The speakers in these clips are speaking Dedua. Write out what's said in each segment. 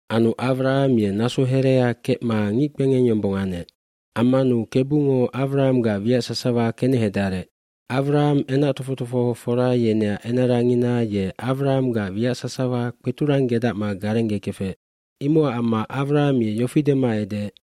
Anu Awraham ye naso herea kecma ngickpengeng yombong anec. Ammanu Kebungo Awrahamgac wiac sasawa kenehedarec. aAwraham enac tofoc tofohofora yeneac enarangina ye Awrahamgac wiac sasawa kpeturanggedacma garenggekefec. Imocac amma Awraham ye yofi dema edeec,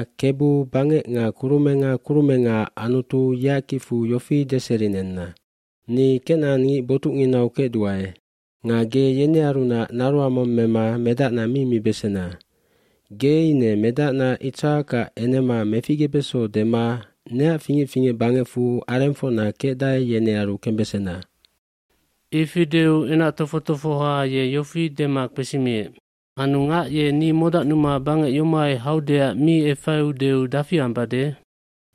bKebu bangec nga kurumenga kurumengaac Anutu yeac kicfu yofi deserinenna. Ni kenacangngic botucnginau kecduae. Nga ge yenearunac naroang mong mema medacna mi mibesena. Ge ine medacna Itsakac enema meficgebeso dema neac fingec fingec bangecfu arengfocna kecdae yenearu kembesena.” Ifi deu enac tofoc tofohoha ye yofi dema kpesimiec, “Anu ngac ye ni modacnuma bangec yomohai haudeac mi efaiudeu dafi ambade?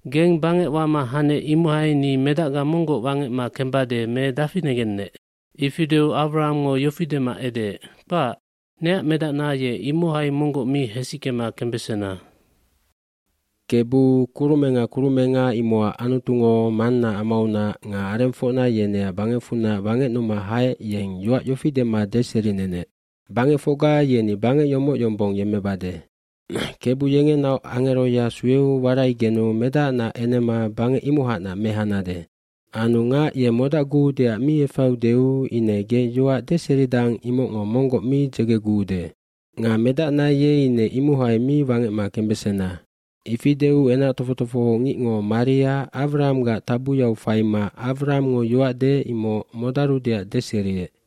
Geng bangec wama hanec imohai ni medacga monggoc wangecma kembade me dafi negennec?” Ifi deu Awrahamngo yofi dema edeec, “Kpac, neac medacna ye imohai monggoc mi hesickema kembesena. cKebu, kurumenga kurumenga imocac Anutungo mannaac amaunac nga arengfocna yeneac bangecfunac wangecnuma haec yeng yoac yofi dema deserinenec, ‘Bangecfocga yeni bangec yomoc yombong yemmebesandua.’ Kebu yengenaoc angeroya sueu waraigenu medacnaac enema bangec imohacnac mehanade. Anu ngac ye modacguudeac mi efaiudeu ine ge yoac deseridang imocngo monggoc mi dzegeguude. Nga medacna ye ine imohai mi wangecma kembesena.” Ifi deu enac tofoc tofohongicngo maria Awrahamgac tabuyau faima Awrahamngo yoac deec imoc modarudeac deseriec.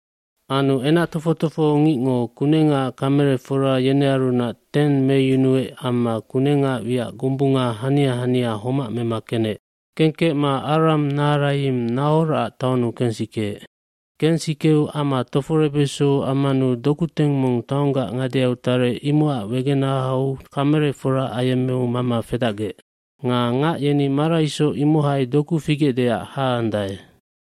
Anu enac tofoc tofohongicngo kunengaac kamelefora yenearunac teng meyunuec amma kunengaac wiac gombunga hania hania homac mema kenec. Kengkecma Aram Naharayimd Nahorac taonnu kensikeec. eKensikeu ama toforebeso ammanu dokuteng mong taonggac ngadeau tarec imocac wegenahau kamelefora ayemmeu mama fedacgec. Nga ngac yeni maraisoc imohai doku figecdeac haandae.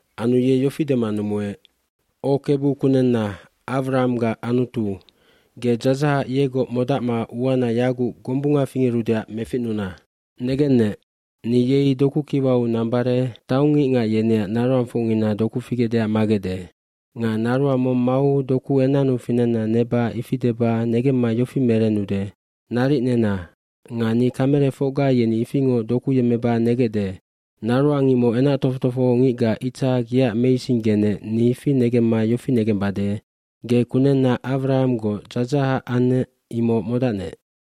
Anu ye yofi dema numuec, “O Kebu, kunenna Awrahamgac Anutu, ge dzadzahac yegoc modacma uana yaguc gombunga fingerudeac meficnuna. Negennec, ni yei doku kiwau nambare taongngicngac yeneac naroangfocngina doku figecdeac magecde. Nga naroang mong mau doku enannu finenna neba ifi deba negemma yofi merennude, ‘Naric nena nga ni kamelefocga yeni ifingoc doku yemmeba negecde.’ Naroang imoc enac tofoc tofohongicga Itsak yeac meisinggenec ni ifi negemma yofi negembade, ge kunenna Awrahamgoc dzadzahac annec imoc modacnec.”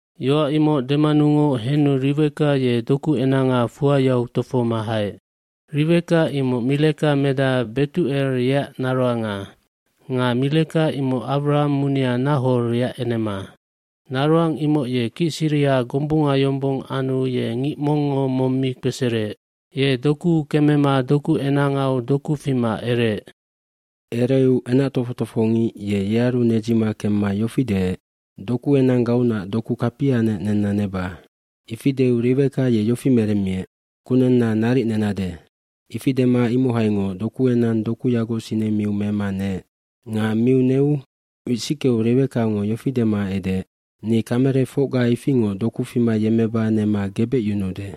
fYoac imoc demanungoc henu Riweka ye dokuenanga fuayau tofohoma haec. Riweka imoc Mileka medaha Betucel yeac naroanga. Nga Mileka imoc Awraham munia Nahor yeac enema. Naroang imoc ye kicsiriha gombunga yombong anu ye ngic mongngo mong mi kpesereec. Ye dokuu kemema dokuenangau doku fima ereec. Ereu enac tofoc tofohongic ye yearu nedzima kemma yofi deec, “Dokuenanggaunac doku kapianec nenna neba.” Ifi deu Riweka ye yofi meremmiec, “Kunenna, naric nenade.” Ifi dema imohaingoc dokuenang dokuyagoc sinemiu mema neec. Nga miu neu wisickeu Riwekango yofi dema edeec, “Ni kamelefocga ifingoc doku fima yemmeba nema gebecyunuude.”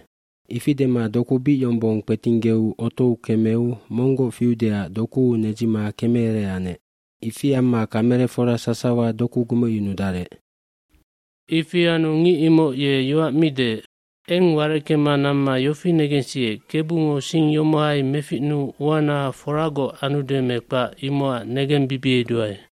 Ifi dema doku bic yombong kpetinggeu otou kemeu monggoc fiudeac dokuu nedzima kemeere anec. Ifi amma kamelefora sasawa doku gumecyunudarec. Ifi anu ngic imoc ye yoac mi deec. Eng wareckema namma yofi negensiec Kebungo sing yomohai meficnuu uana foragoc anude me kpac imocac negembibieduae.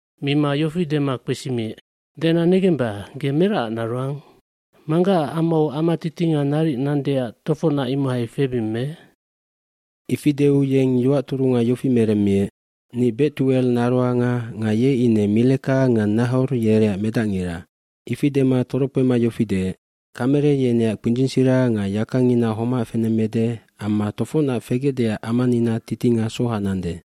Mima yofi dema kpesimiec, “Dena negemba, ge meracac naroang? Manggaac amau ama titinga naric nandeac tofocnac imohai febing me?” iIfi deu yeng yoac turunga yofi meremmiec, “Ni Betucel naroanga nga ye ine Mileka nga Nahor yereac medacngira.” Ifi dema torokpema yofi deec, “Kamele yeneac kpindzingsira nga yakangina homac fenemmede amma tofocnac fegecdeac amanina titinga soha nande.”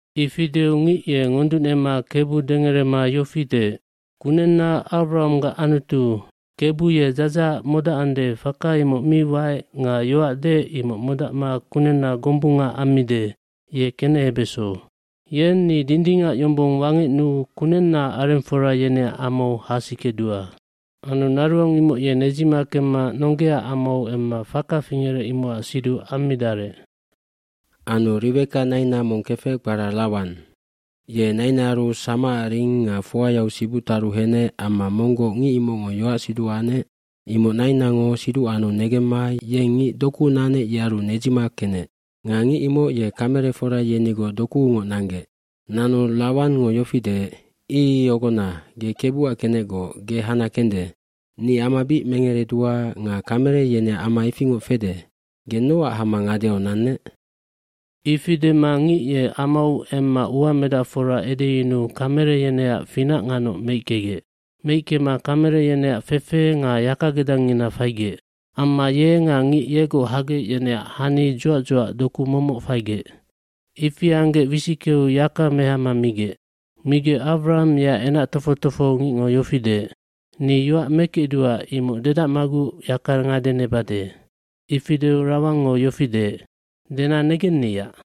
Ifi deu ngic ye ngoducnema Kebu dengerema yofi deec, “Kunenna Awrahamgac Anutu, Kebu ye dzadzahac modacande faka imoc mi waec nga yoac deec imoc modacma kunenna gombunga ammide ye kenehebeso. Yeng ni dindingac yombong wangecnuu kunennaac arengfora yeneac amau hasikedua.” Anu naroang imoc ye nedzima kemma nonggeaac amau emma faka fingerec imocac siduc ammidarec. Anu Riweka naina mong kefec kpara Lawan ye nainaaru samacac ring nga fuyau sibuc taru henec amma monggoc ngic imocngo yoacsiduc anec imoc nainango siduc anu negemma yeng ngic dokuu nanec yearu nedzima kenec. Nga ngic imoc ye kamelefora yenigoc dokuungoc nanggec. Nanu Lawangngo yofi deec, “Ii ogona, ge Kebuac kenecgoc, ge hana kende. Ni ama bic mengeredua nga kamele yeneac ama ifingoc fede. Ge nocac hama ngadeau nannec?” Ifi dema ngic ye amau emma uamedacfora edeyunuu kamele yeneac finac nganoc meickegec. Meickema kamele yeneac fefe nga yakagedangngina faigec. Amma ye nga ngic yegoc hagec yeneac hani dzuac dzuac doku momoc faigec. Ifi anggec wisickeu yaka mehama migec. Migec Awraham yeac enac tofoc tofohongicngo yofi deec, “Ni yoac mekecduae imoc dedacmaguc yaka ngade nebade.” Ifi deu Lawangngo yofi deec, “Dena negenniyac.”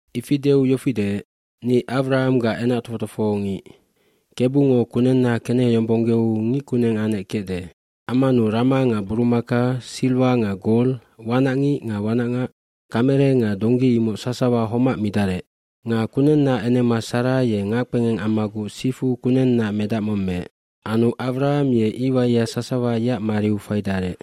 Ifi deu yofi deec, “Ni Awrahamgac enac tofoc tofohongic. jKebungo kunenna keneheyombonggeu ngic kuneng anec kecde. Ammanu rama nga burumaka, silwa nga gol, wanacngic nga wanacngac, kamele nga donggi imoc sasawa homac midarec. kNga kunennaac enema Sara ye ngackpengeng ammaguc sifu kunennaac medac mong meec. Anu Awraham ye iwaia sasawa yeac mariu faidarec.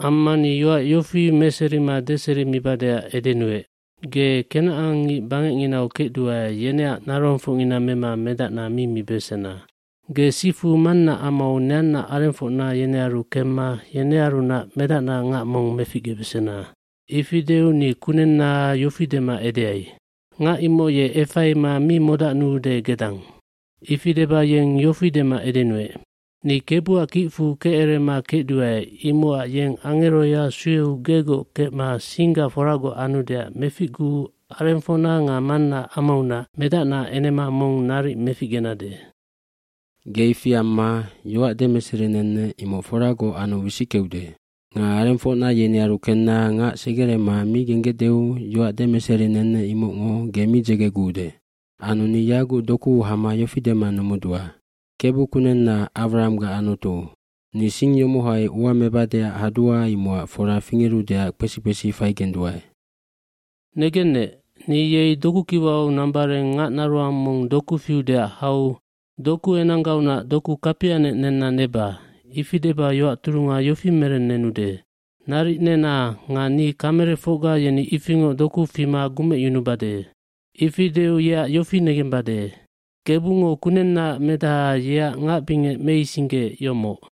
Amma ni yoac yofi demeserima deserimibadeac edenuec, ‘Ge kenacangngic bangecnginau kecduae yeneac naroangfocngina mema medacna mi mibesena. Ge sifu mannaac amau neanna arengfocna yenearu kemma yenearunac medacnaac ngac mong meficgebesena.’ Ifi deu ni kunenna yofi dema edeai, ‘Ngac imoc ye efaima mi modacnuude gedang.’ Ifi deba yeng yofi dema edenuec, ‘Ni Kebuac kicfu kecerema kecduae imocac yeng angeroya sueu gegoc kecma singga foragoc anudeac meficguu arengfocna nga mannaac amaunac medacnaac enema mong naric meficgenade. Ge ifi anna yoac demeserinennec imoc foragoc anu wisickeude. Nga arengfocna yenearu kenna ngac segerema mi genggecdeu yoac demeserinennec imocngo ge mi dzegeguude.’ Anu ni yaguc dokuu hama yofi dema numudua, Kebu, kunenna Awrahamgac Anutu, ni sing yomohai ua mebadeac hadua imocac fora fingerudeac kpesi kpesi faigenduae. Negennec, ni yei dokukiwau nambareng ngacnaroang mong doku fiudeac hau, “Dokuenanggaunac doku kapianec nenna neba.” Ifi deba yoac turunga yofi merennenude, “Naric nena nga ni kamelefocga yeni ifingoc doku fima gumecyunubade.” Ifi deu yeac yofi negembade. Kebungo kunennaac medaha yeac ngacbingec meisinggeec yomoc.’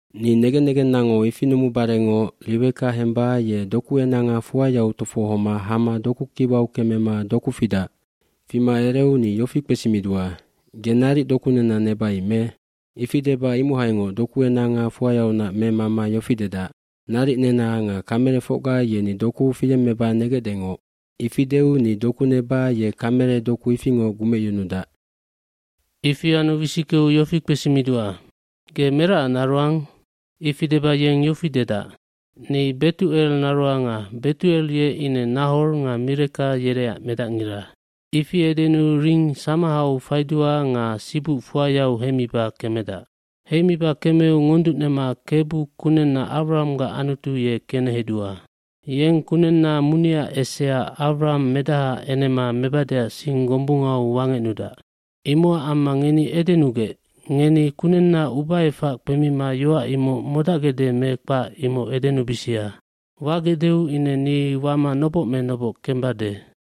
Ni negen negennango ifi numubarengoc Riweka hemba ye dokuenanga fuayau tofohoma hama dokukiwau kemema doku fidac. Fima ereu ni yofi kpesimidua, ‘Ge naric doku nenna nebai me.’ Ifi deba imohaingoc dokuenanga fuayaunac memama yofi dedac, ‘Naric nena nga kamelefocga yeni doku fiyemmeba negecdengoc.’ Ifi deu ni doku neba ye kamele doku ifingoc gumecyunudac. Ifi anu wisickeu yofi kpesimidua, ‘Ge meracac naroang?’ Ifi deba yeng yofi dedac, ‘Ni Betucel naroanga, Betucel ye ine Nahor nga Mileka yereac medacngira.’ Ifi edenuu ring samahau faidua nga sibuc fuayau heimiba kemedac. Heimiba kemeu ngonducnema Kebu, kunenna Awrahamgac Anutu ye kenehedua. Yeng kunenna muniaac esea Awraham medahaac enema mebadeac sing gombungau wangecnudac. Imocac amma ngeni edenugec, ngeni kunenna ubaefac kpemima yoac imoc modacgecde me kpac imoc edenubisia. Wagecdeu ine ni wama noboc me noboc kembade.”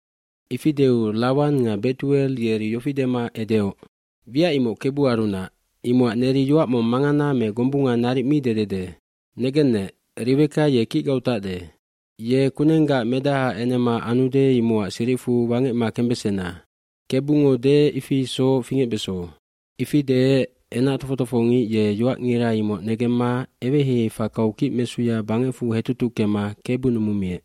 Ifi deu Lawan nga Betucel yeri yofi dema edeoc, “Wiac imoc Kebuarunac, imocac neri yoac mong mangana me gombunga naric mi dedede. Negennec, Riweka ye kicgau tacde. Ye kunenggaac medahaac enema anude imocac siricfu wangecma kembesena. Kebungo deec ifi isoc fingecbeso.” Ifi deec enac tofoc tofohongic ye yoacngira imoc negemma eweheihei fakau kicmesuya bangecfu hetutuckema Kebu numunemiec.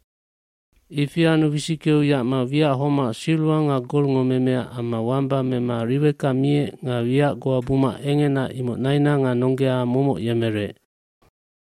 Ifi anu wisickeu yacma wiac homac silwa nga golngo memea amma wamba mema Riweka miec nga wiac goa buma engena imoc naina nga nonggea momoc yemerec.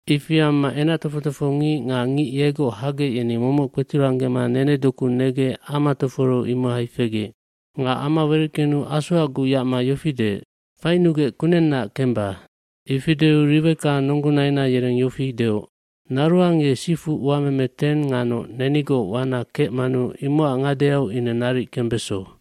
Ifi amma enac tofoc tofohongic nga ngic yegoc hagec yeni momoc kpeturanggema nenedoku negec ama toforeu imohai fegec. Nga ama wereckenu asoacguc yacma yofi deec, “Fainugec kunennaac kemba.” Ifi deu Riweka nonggonaina yereng yofi deoc, “Naroang ye sifu uameme teng nganoc nenigoc wana kecmanu imocac ngadeau ine naric kembeso.”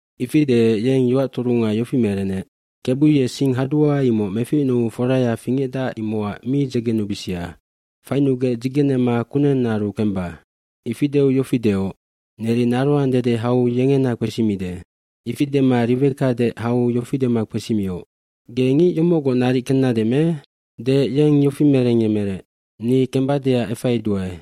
Ifi deec yeng yoac turunga yofi merenec, Kebu ye sing hadua imoc meficnuu foraya fingecdac imocac mi dzegenubisia, fainugec dzigenema kunennaaru kemba.” Ifi deu yofi deoc, “Neri naroang dede hau yengena kpesimide.” Ifi dema Riweka deec hau yofi dema kpesimioc, “Ge ngic yomocgoc naric kennade me?” Deec yeng yofi merengyemerec, “Ni kembadeac efaiduae.”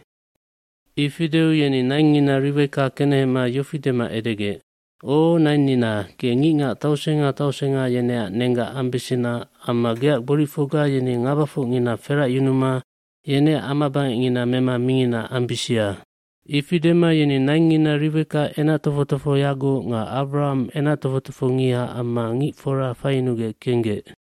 lIfi deu yeni naingngina Riweka kenehema yofi dema edegec, “O nainnina, ge ngicngac tausenga tausenga yeneac nenggac ambesena amma geac gboricfocga yeni ngabafocngina feracyunuma yeneac amabangecngina mema mingina ambisia.” Ifi dema yeni naingngina Riweka enac tofoc tofohoyagoc nga Awraham enac tofoc tofohongiha amma ngicfora faiyunugec kenggec.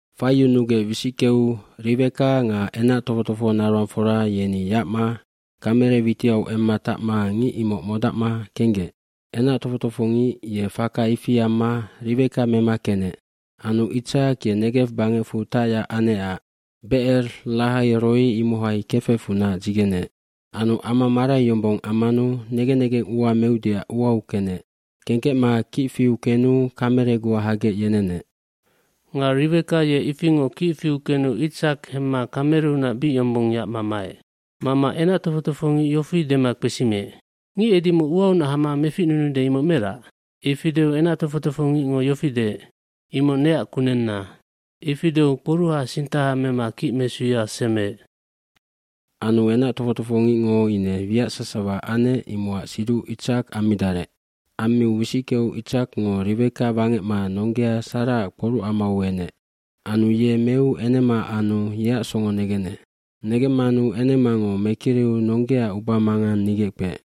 Faiyunugec wisickeu Riweka nga enac tofoc tofohonaroangfora yeni yacma kamele witiau emma tacma ngic imoc modacma kenggec. Enac tofoc tofohongic ye faka ifi amma Riweka mema kenec. mAnu Itsak ye Negew bangecfu tacyac anecac Becer Lahai Roi, imohai kefecfunac dzigeneec. Anu ama marai yombong ammanu negen negeng ua meudeac uau kenec. Kengkecma kic fiu kenu kamele goa hagec yenenec. Nga Riweka ye ifingoc kic fiu kenu Itsak hemma kameleunac bic yombong yacma maec. Mama enac tofoc tofohongic yofi dema kpesimiec, “Ngic edimoc uaunac hama meficnunude imoc merac?” Ifi deu enac tofoc tofohongicngo yofi deec, “Imoc neac kunenna.” Ifi deu kporucsusuha mema kicmesuya semeec. Anu enac tofoc tofohongicngo ine wiac sasawa anec imocac siduc Itsak ammidarec. nAmmiu wisickeu Itsakngo Riweka wangecma nonggea Saraac kporucamau enec. Anu ye meu enema anu yeac songo negenec. Negemmanu enemango mekiriu nonggeaac ubamangang nigeckpeec.